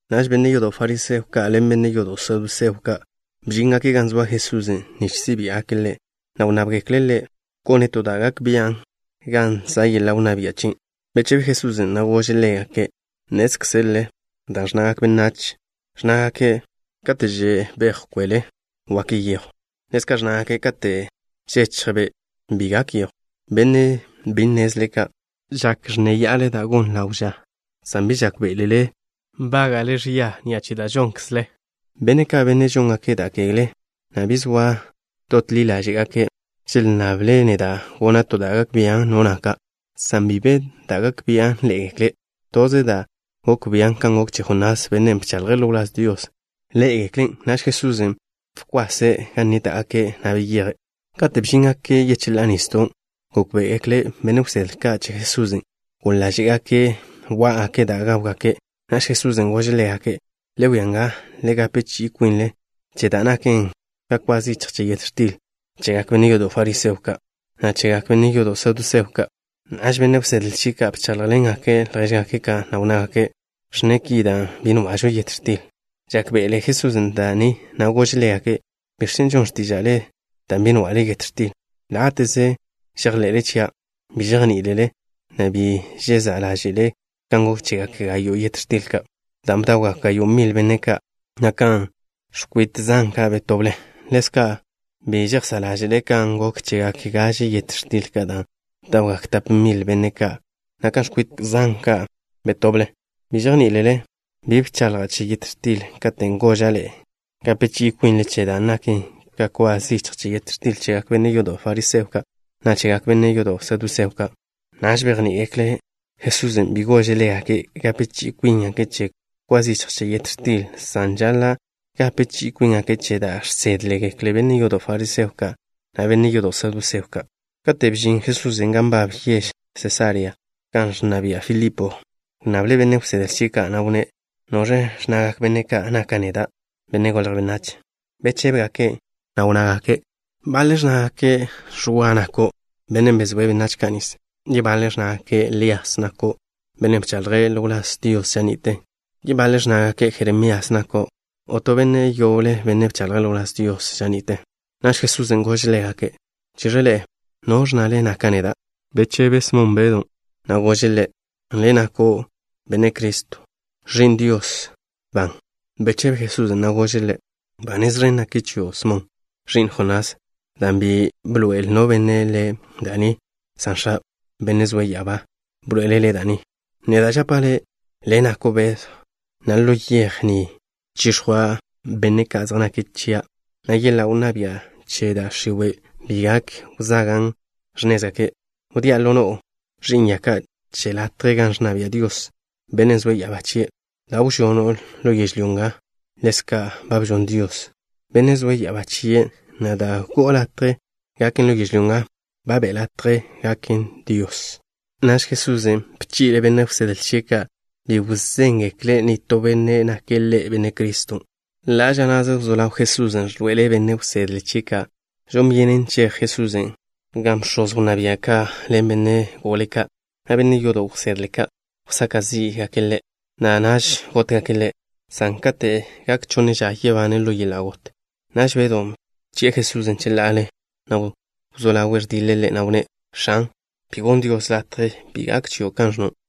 Naž benne' yodo' fariseo ka' ḻen benne' yodo' saduseo ka' bžíngake' gan zoa Jesusen' nich si' biá'gake' Ḻe', na' wnnábgekle' Ḻe' gone' to da' gak bian' gan za' yeḻa' wnná bia' chien'. Bechebe Jesusen', na' gože' ḻégake': —Nnézkzele dan' ẕnnagak benách, ẕnnágake': “Kate' že' bejw kwele, wak yejw.” Ḻezka' ẕnnagake': “Kate' žechj be' bi gak yejw.” ¡Benne' bi nnezle ka'! ¡Žak nneya'ale da' gon ḻawe' ža, san bi žákbe'elele nbága'le ẕia ni'a che da' žónkzelele! Benne' ka', benne' žóngake' da' kegle, na' bi zoa dot ḻi ḻáže'gake', želnnable' neda' gona' to da' gak bian' no naka', san bi be da' gak bian' ḻé'egekle'. Toze dan' gok bian' kan gok che Jonás, bennen' bchaḻje' ḻo wláz Dios, ḻé'egeklen'. Naž Jesusen' bkwase' gan nníta'gake', na' beyeje'. Kate' bžíngake' yecheḻá'a nisdon', gókbe'egekle benne' wsedle ka' che Jesusen' goḻ ḻáže'gake' wá'gake' da' gáwgake'. Naž Jesusen' gože' ḻégake': —Le wia nga. Le gape chi'i kwinle che da' naken ka kwa zichj che yet x̱til chegak benne' yodo' fariseo ka', na' chegak benne' yodo' saduseo ka'. Naž benne' wsedle chie' ka' bcháḻjḻengake' ljéžgake' ka', na' wnnágake': —Ẕnne' ki dan' bi nwa'žo yet x̱til. Žákbe'ele Jesusen' da' ni, na' gože' ḻégake': —¿Biẕ chen' žon x̱tíža'le dan' bi nwa'le yet x̱til? Láte'ze žejḻe'le chia'. ¿Bi žejní'ilele, na' bi žezá' ḻáže'le kan gok chegak gayo' yet x̱til ka', dan' bdawgak gayo' mil benne' ka', na' kan x̱kwit zan ka' betoble? ¿Ḻezka' bi žejsá' ḻáže'le kan gok chegak gaže yet x̱til ka', dan' bdawgak tap mil benne' ka', na' kan x̱kwit zan ka' betoble? ¿Bi žejní'ilele? Bi bchaḻja' che yet x̱til katen' goža' ḻe'e gape chi'i kwinle che da' naken ka kwa zichj che yet x̱til chegak benne' yodo' fariseo ka', na' chegak benne' yodo' saduseo ka'. Naž bejní'igekle' Jesusen' bi gože' ḻégake' gape chi'i kwíngake' che kwa zichj che yet x̱til, san žaḻa' gape chi'i kwíngake' che da' žsédgekle benne' yodo' fariseo ka', na' benne' yodo' saduseo ka'. Kate' bžin Jesusen' gan nbab yež Sesarea, gan ẕnna bia' Filipo, wnnable' benne' wsedle chie' ka', na' wnné': —¿Noẕ ẕnnagak benne' ka' naka' neda', Benne' Golje' Benách? Bechébegake', na' wnnágake': —Baḻe' ẕnnágake': “Ẕwa nako', bennen' bezóe' benách ka' nis.” Yebaḻe' ẕnnágake': “Lías nako', bennen' bchaḻje' ḻo wláz Dios ža ni'te.” Yebaḻe' ẕnnágake': “Jeremías nako', o to benne' yoble, benne' bchaḻje' ḻo wláz Dios ža ni'te.” Naž Jesusen' gože' ḻégake': —Cheẕe ḻe'e, ¿noẕ ẕnnale naka' neda'? Bechebe Smon Bedw, na' gože' Ḻe': —Le' nako' Benne' Criston', Ẕi'n Dios ban. Bechebe Jesusen', na' gože' ḻe': —Ba nez ẕen naken chio', Smon, ẕi'n Jonás, dan' bi bḻoe'el no benne' le' da' ni, san X̱a', Bennen' zoe' ya'abá, bḻoe'ele' le' da' ni. Neda' žapa' le', le' nako' Bedw, na' ḻo yej ni chix̱jwa' benne' ka' zej nake' chia', na' yeḻa' wnná bia' che da' x̱iwe' bi gak wzagan' x̱nézgake'. Wdía' ḻo no'o ẕi'n ya ka' che latje gan ẕnna bia' Dios, Bennen' zoe' ya'abá chie'. Da' wžono' ḻo yežlyó nga, ḻezka' ba bžon Dios, Bennen' zoe' ya'abá chie', na' da' go'o latje gaken ḻo yežlyó nga, ba be' latje gaken Dios, Bennen' zoe' ya'abá chie'. Naž Jesusen' bchi'le' benne' wsedle chie' ka' bi wzéngekle' nitó benne' nake' Ḻe' Benne' Criston'. Ḻa' ža na'ze wzó ḻaw Jesusen' ẕḻoe'ele' benne' wsedle chie' ka' žon byenen cheje' Jerusalén, gan bx̱oz wnná bia' ka' ḻen benne' gole ka', na' benne' yodo' wsedle ka', wsaka' zí'gake' Ḻe', na' naž gótgake' Ḻe', san kate' gak chonne ža, yebane' ḻo yeḻa' got. Naž Bedw bchi'e Jesusen' cheḻa'ale, na' wzó ḻawe' ẕdiḻe' Ḻe', na' wnné': —X̱an, bi gonn Dios latje. Bi gak chio' kan ẕnno'.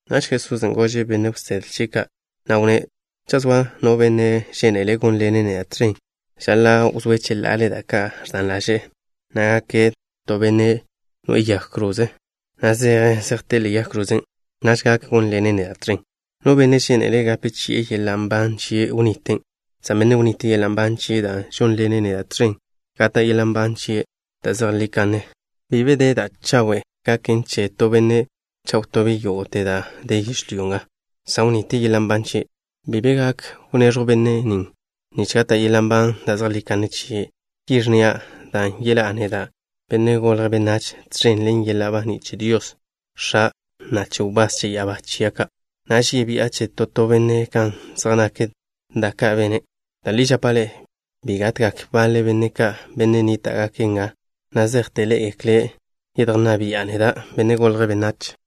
Naž Jesusen' gože' benne' wsedle chie' ka', na' wnné': —Cha' zoa no benne' žénele' gónḻene' neda' tẕen, žaḻa' wzóe' cheḻa'ale da' ka' ẕdan ḻaže'e, na' gake' ka to benne' noe'e yag kroze, na' zeje' zejté'e ḻe'e yag krozen'. Naž gak gónḻene' neda' tẕen. No benne' žénele' gape chi'e yeḻa' nban chie', wniten', san benne' wnite' yeḻa' nban chie' dan' žónḻene' neda' tẕen, gata' yeḻa' nban da' zejlí kanne chie'. Bi be da' chawe' gaken che to benne' cha' wtobe' yógo'te da' den yežlyó nga san wnite' yeḻa' nban chie'. Bi be gak wneẕjw bennen' nich gata' yeḻa' nban da' zejlí kanne chie'. Ki ẕnnia', dan' yeḻá'a neda', Benne' Golje' Benách, tẕen ḻen yeḻa' baní' che Dios, X̱a', na' che wbás che ya'abá chia' ka'. Naž yebi'a che to to benne' kan zej nak da' ka' bene'. Da' li žapa' ḻe'e: bi gatgak baḻe benne' ka', benne' nníta'gake' nga, na' zejte ḻé'egekle' yedjnná bi'a neda', Benne' Golje' Benách.